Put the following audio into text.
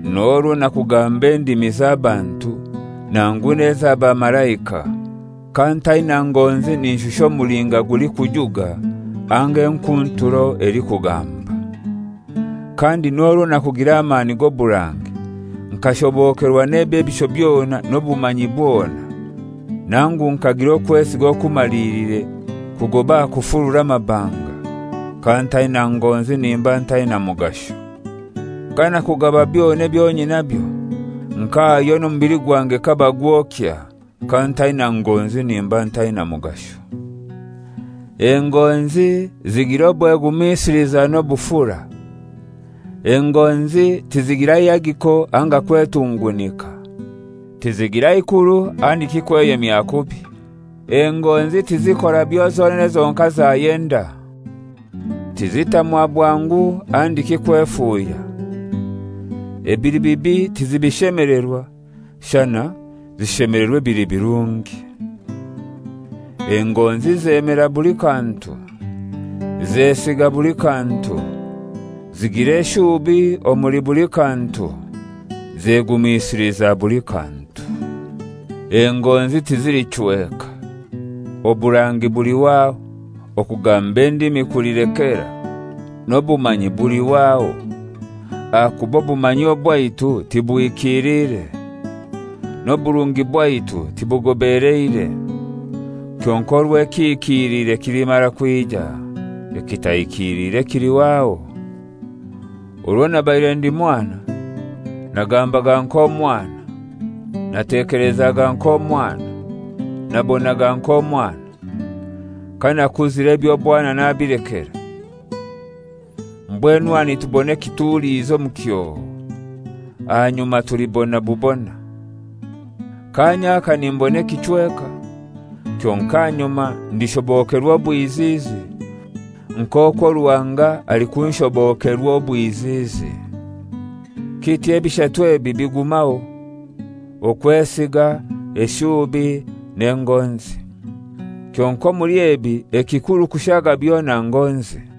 N'orwo nakugamba endimi z'abantu nangu n'ez'abamalaika, kantaina ngonzi ninshusha omulinga gulikujuga anga enkunturo elikugamba. Kandi n'orwo nakugira amani g'oburangi, nkashobokerwa n'ebyebisho byona n'obumanyi bwona, nangu nkagira okwesiga okumaliliire kugoba aha kufurura amabanga, kantaina ngonzi nimba ntaina mugasho. Kanakugaba byona ebyo nyinabyo, nkahayo n'omubili gwange kabagwokya, kantaina ngonzi nimba ntaina mugasho. Engonzi zigira obwegumisiliza n'obufura; engonzi tizigira ihagiko anga kwetungunika. Tizigira ikuru handiki kweyemya kubi. Engonzi tizikora byo zonene zonkai zayenda; tizitamwa bwangu handiki kwefuuhya. Ebili bibi tizibishemelerwa, shana zishemelerwa ebili birungi. Engonzi zemera buli kantu, zesiga buli kantu, zigira eshuubi omuli buli kantu, zegumisiliza buli kantu. Engonzi tizilichweka. Oburangi bulihwaho; okugamba endimi kulilekera; n'obumanyi bulihwaho. Ahakuba obumanyi obwaitu tibuhikiliire, n'oburungi bwaitu tibugobeleire. Kyonkai orwo ekihikilire kilimara kwija, ekitahikiliire kilihwaho. Orwo nabaire ndi mwana, nagambaga nk'omwana, natekelezaga nk'omwana, nabonaga nk'omwana. Kanakuzire eby'obwana nabilekera. Mbwenu aha nitubona ekituliizi omu kyoo. Ahanyuma tulibona bubona. Kaanya aka nimbona ekichweka; kyonkai ahanyuma ndishobokerwa obwiziizi, nk'okwo Ruhanga alikunshobokerwa obwiziizi. Kityo ebishatu ebi bigumaho, okwesiga, eshuubi n'engonzi. Kyonkai omuli ebi ekikuru kushaaga byona ngonzi.